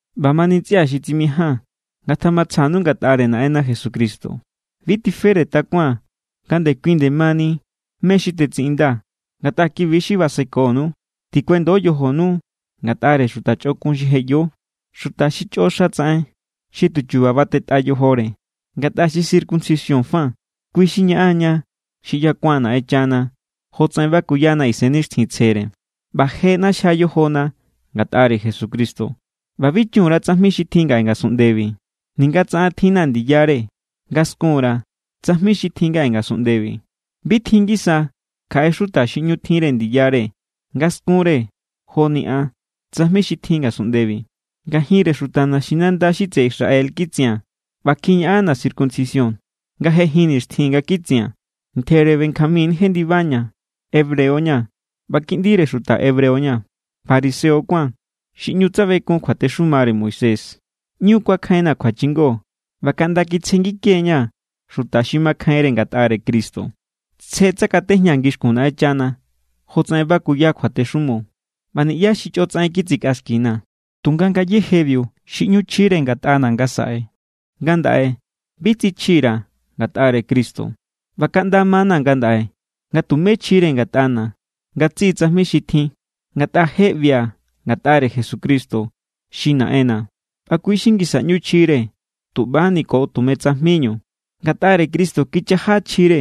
ꞌBamani ntsꞌia̱ xi tsimijaa̱n, ngatjamatsjanu ngatꞌare Naꞌenna Jesucristo. Bi tifere takuaa̱n nga ndekui nde mani mé= xi tetsiꞌindaa̱, ngatꞌa kibi= xi basekonu. Tikuendo yojonu ngatꞌare xuta chꞌokun xi je ꞌyo, xuta xi chꞌo xa tsaꞌen, xi tuchuba batetꞌa yojore. Ngatꞌa xi circuncisión fa, kui xi ñaꞌan=ña xi ꞌyakuan Naꞌenchana jotsaꞌen bakuyana Isennixtjintsjere, ꞌba je ꞌnaxjia yojona ngatꞌare Jesucristo, ꞌba bi chun_ra tsajmi xi tjin ngaꞌe ngasunꞌndebi. Ninga tsa an tjinna̱ ndiyare nga skun_ra̱ tsajmi xi tjin ngaꞌe ngasunꞌndebi. Bi tjin ngisa kjaꞌe xuta xi ꞌñu tjinre ndiyare nga skunre joni an tsajmi xi tjin ngasunꞌndebi. Ngajinre xuta naxinanda xi tseꞌe Israel kitsia̱n ꞌba kjiñaꞌanna̱ circuncisión nga je jin nixtjin nga kitsia̱n. Ntjere Benjamín jendibaña̱. Hebreo= ña̱ ꞌba kiꞌndire xuta hebreo= ña̱. Fariseo kuáa̱n xi ꞌñu tsabekun kjuatexumare Moisés. ꞌÑu kuakjainna̱ kjuachingo ꞌba kaꞌnda kitsjengike=ña̱ xuta xi makjainre ngatꞌare Cristo. Tsje tsakatejñaa̱ ngixkun Naꞌenchana jotsaꞌen bakuya kjuatexumo. ꞌBa niꞌyá xi chꞌo tsaꞌen kitsikꞌaxkina̱. Tunga ngayéjebiu xi ꞌñu chjire ngatꞌana̱ ngasaꞌe, ngandaꞌe bi tsichjira̱ ngatꞌare Cristo. ꞌBa kaꞌnda ma=na̱ ngandaꞌe nga tumé chjire ngatꞌana̱ ngatsiꞌi tsajmi xi tjin, ngatꞌa je ꞌbia̱ ngatꞌare Jesucristo xi Naꞌenna̱. ꞌBa kui= xi ngisa ꞌñu chjire tuꞌbani ko tume tsajminu. Ngatꞌare Cristo kichaja chjire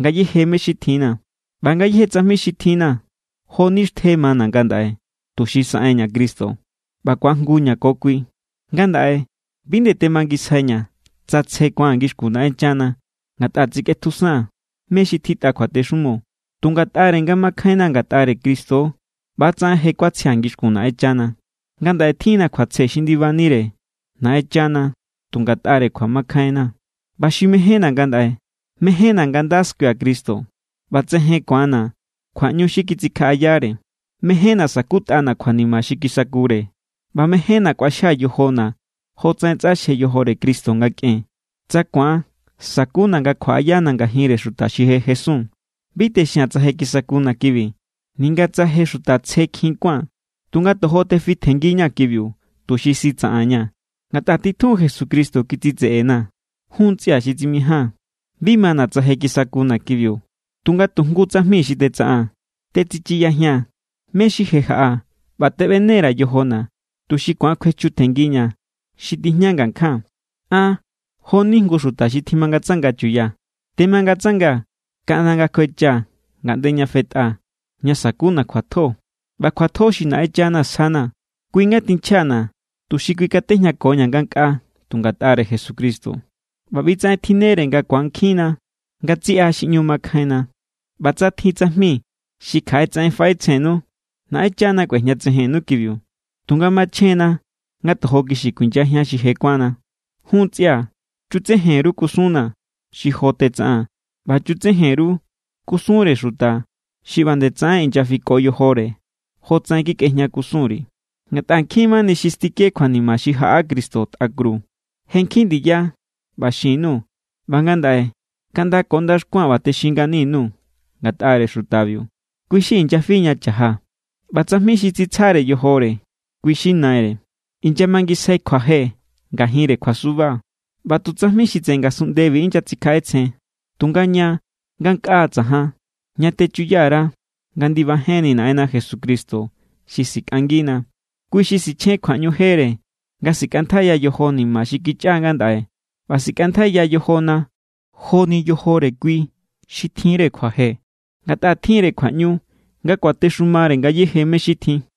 ngayéje mé= xi tjinna̱. ꞌBa ngayéje tsajmi xi tjinna̱ jo=ni xtje mana̱ ngandaꞌe, tuxi saꞌenña̱ Cristo ꞌba ku̱ajngu ña̱ ko kui. Ngandaꞌe bi nde temangisjaiña̱ tsa tsje ku̱an ngixkun Naꞌenchana ngatꞌa tsikꞌetjusaa̱n mé= xi tjitꞌa kjuatexumo. Tu ngatꞌare nga makjainna ngatꞌare Cristo=, ꞌbatsaꞌen je= kuatsjia̱ ngixkun Naꞌenchana. Ngandaꞌe tjinna̱ kjuatsje xi ndibanire Naꞌenchana tu ngatꞌare kjuamakjainna̱. ꞌBa xi mejénna̱ ngandaꞌe, mejénna̱ nga nda skuia̱ Cristo ꞌba tsejen ku̱anna̱ kjuaꞌñu xi kitsikjaꞌayare. Mejénna̱ sa̱kutꞌana̱ kjuanima xi kisakure. ꞌBa mejénna̱ kꞌuaxjia̱ yojona̱ jotsaꞌen tsꞌaxje yojore Cristo nga kꞌen, tsa ku̱an sakuna̱ nga kjuaꞌayana̱ ngajinre xuta xi je jesun. Bi texia̱n tsa je kisakuna̱ kibi, ninga tsa je xuta tsjekjin kuáa̱n. Tunga tojo tefitjenngiña̱ kibiu tuxi sitsaꞌanña̱, ngatꞌa titjun Jesucristo kitsitseꞌena̱. Jun ntsꞌia̱ xi tsimijaa̱n, bi mana̱ tsa je kisakuna̱ kibiu. Tunga tu jngu tsajmi xi tetsaꞌaa̱n, tetsichiyajia̱n mé= xi je jaꞌa ꞌba teꞌbene_ra̱ yojona̱ tuxi ku̱an kjuechutjenngiña̱ xi tijña ngakjaa̱n. An jo=ni jngu xuta xi tjimangatsanga chuya. Temangatsangaa̱ kaꞌnda nga kjuechaa̱ ngaꞌnde ña fetꞌa ña sa̱kuna̱ kjuatjo. ꞌBa kjuatjo xi Naꞌenchana sjana̱ kui= nga tinchjana̱ tuxi kuikatejñakoña̱ ngankꞌaa tu ngatꞌare Jesucristo. ꞌBa ꞌbitsaꞌen tjinnere nga ku̱ankjinna ngatsiꞌa xi ꞌñu makjainna. ꞌBa tsa tjin tsajmi xi kjaꞌe tsaꞌen faꞌetsjennu, Naꞌenchana kꞌuejñatsejennu kibiu. Tunga machjenna nga tojo kixi kuinyajian xi je kuánna. Jun ntsꞌia̱, chutsejen_ru kusunna̱ xi jo tetsaꞌaa̱n ꞌba chutsejen_ru kusunre xuta xi ꞌba nde tsaꞌen inyafiko yojore jotsaꞌen kikꞌejñakusunri̱. Ngatꞌa nkjin mani xi stike kjuanima xi jaꞌa Cristo tꞌa kru. Je nkjin ndiya ꞌba xin_nuu̱ ꞌba ngandaꞌe kaꞌnda ko ndaxkua̱n ꞌba texin ngani_nuu̱ ngatꞌare xutabiu. Kui xi inyafi ña cha̱ja. ꞌBa tsajmi xi tsitsjare yojore, kui= xi naire. Inyamangisjai kjuaje ngajinre kjuasuba. ꞌBa tu tsajmi xi tseꞌe ngasunꞌndebi inyatsikjaꞌetsjen. Tunga ña ngankꞌaa tsajan, ña techuya_ra nga ndibajenni Naꞌenna Jesucristo xi sikꞌangina. Kui= xi sichjen kjuaꞌñu jere nga sikꞌantjaiya yojo ni̱ma̱ xi kichꞌa ngandaꞌe ꞌba sikꞌantjaiya yojona joni yojore kui xi tjinre kjuaje. Ngatꞌa tjinre kjuaꞌñu nga kuatexumare ngayéje mé= xi tjin.